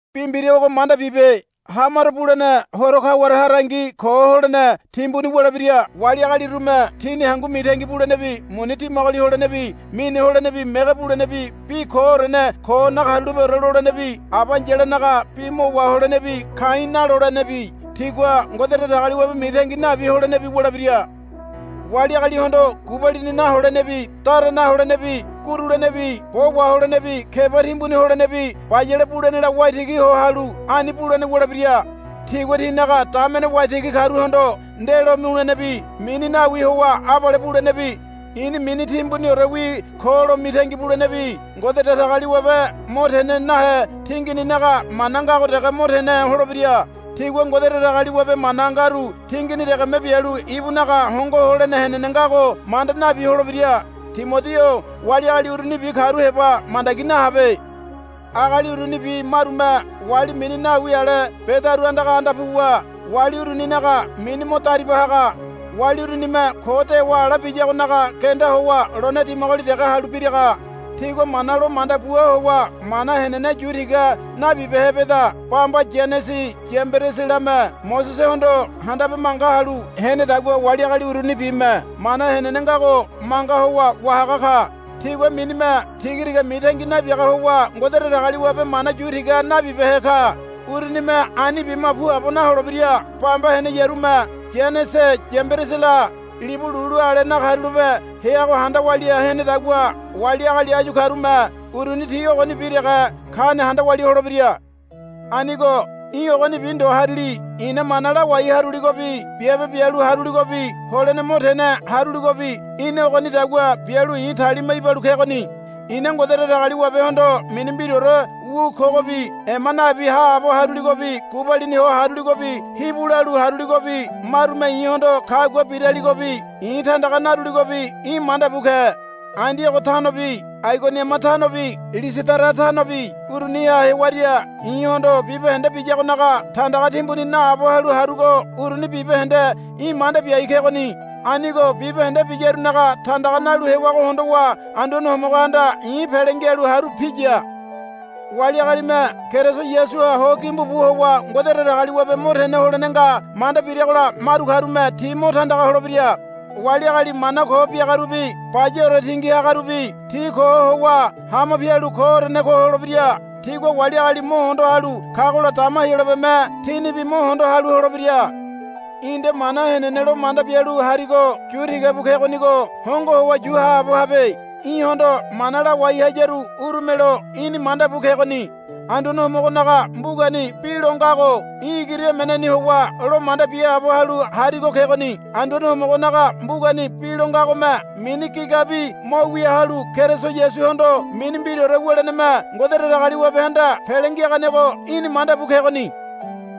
Bi mbira ogo manda bibe. Hamaro bulene horo kaware harangi ko holene timbuni wulebira. Wali agalirume tini hangu mitangi bulenebi muni dimagoli holenebi mine holenebi mege bulenebi bi koorene ko nakarulapeore lolenebi aba ai̱yalanaga bi mo waholenebi ka̱i̱ nalolenebi tigua Ngode Datagaliwabe mitangi nabi holenebi wulebira. Wali agalihondo gubalini naholenebi dara naholenebi gurulenebi bo waholenebi keba timbuni holenebi bayale bulenela waitigi ho halu ani bulene wulebira. Tigua tinaga damene waitigi karuhondo ndelo mulenebi mini nawi howa abale bulenebi, I̱ni mini timbuniorewi ko, lo mitangi bulenebi Ngode Datagaliwabe mo tene nahe tingininaga mana ngago dege mo tene holebira. Tigua Ngode Datagaliwabe mana ngaru tingini degeme bialu ibunaga hongo holene henene ngago manda nabi holebira. Timodi-o wali agali urunibi karu heba mandagi nahabe. Agali urunibi marume wali mini nawi ale bedaru andaga anda puwa wali uruninaga mini mo dariba haga. Wali urunime ko dewa ala biyagonaga genda howa lone dimagoli dege halu biraga. Tigua mana lo manda bua howa mana henene yu tiga nabibehe beda. Bamba Yanese Yambereselame Mosesehondo handabe manga halu henedagua wali agali urunibime mana henene ngago manga howa wahaga ka. Tigua minime tigatiga mitangi nabiaga howa Ngode Datagaliwabe mana yu tiga nabibehe ka. Urunime ani bima puabo naholebira. Bamba heneyarume Yanese Yamberesela libu lulu ale nakarulape heago handa walia henedagua wali agali áyu karume uruni ti ogonibi dege kane handa walia holebira. Anigo í̠ ogonibi ndo harili. I̱na mana lawai haruligobi biabe bialu haruligobi holene mo tene haruligobi í̠na ogonidagua bialu i̱ talima ibalu kegoni. I̱na Ngode Datagaliwabehondo mini mbiraore wu kogobi ema nabi haabo haruligobi gubalini ho haruligobi hibu lalu haruligobi marume i̱hondo kagua biraligobi i̱ tandaga naruligobi í̠ manda bu ke. Andiogo tanobi Aigoniama tanobi Lisidara tanobi uruniha hewaria i̱hondo bibahende biyagonaga tandaga timbuni naabo halu harugo uruni bibahende í̠ manda biai kegoni. Anigo bibahende biyarunaga tandaga nalu hewago hondowa Anduane Homogohanda i̱ pele ngialu haru piya. Wali agalime Keriso Yasuha ho gimbu bu howa Ngode Datagaliwabe mo tene holene nga manda biragola maru karume ti mo tandaga holebira. Wali agali mana ko biagarubi bayaore tingi hagarubi ti ko howa hama pialu koorene ko holebira. Tigua wali agali mo hondo halu kagola dama Heyolabeme tinibi mo hondo halu holebira. Í̠ nde mana henene lo manda bialu harigo yu tiga bu kegonigo hongo howa yu haabo habe. Í̠hondo mana lawai hayaru urumelo í̠ni manda bu kegoni. Anduane Homogonaga mbugani bi lo ngago í̠ igiri emeneni howa lo manda biaabo halu harigo kegoni. Anduane Homogonaga mbugani bi lo ngagome mini gigabi mo wia halu Keriso Yasuhondo mini mbiraore wuleneme Ngode Datagaliwabehanda pele ngiaganego í̠ni manda bu kegoni.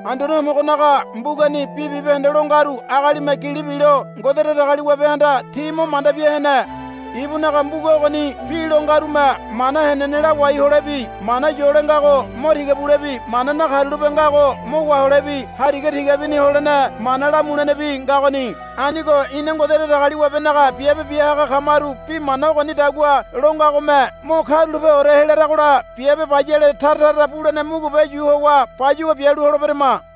Anduane Homogonaga mbugani bi bibahende lo ngaru agalime gili bilo Ngode Datagaliwabehanda ti mo manda bia hene. Ibunaga mbuga ogoni bi lo ngarume mana henene lawai holebi mana yole ngago mo tiga bulebi mana nakarulape ngago mo waholebi hariga tigabini holene mana lamulenebi ngagoni. Anigo ina Ngode Datagaliwabenaga biabe biahaga kamaru bi mana ogonidagua lo ngagome mo karulapeore helaragola biabe bayale tara tara bulene mugube yu howa bayuwa bialu holeberama.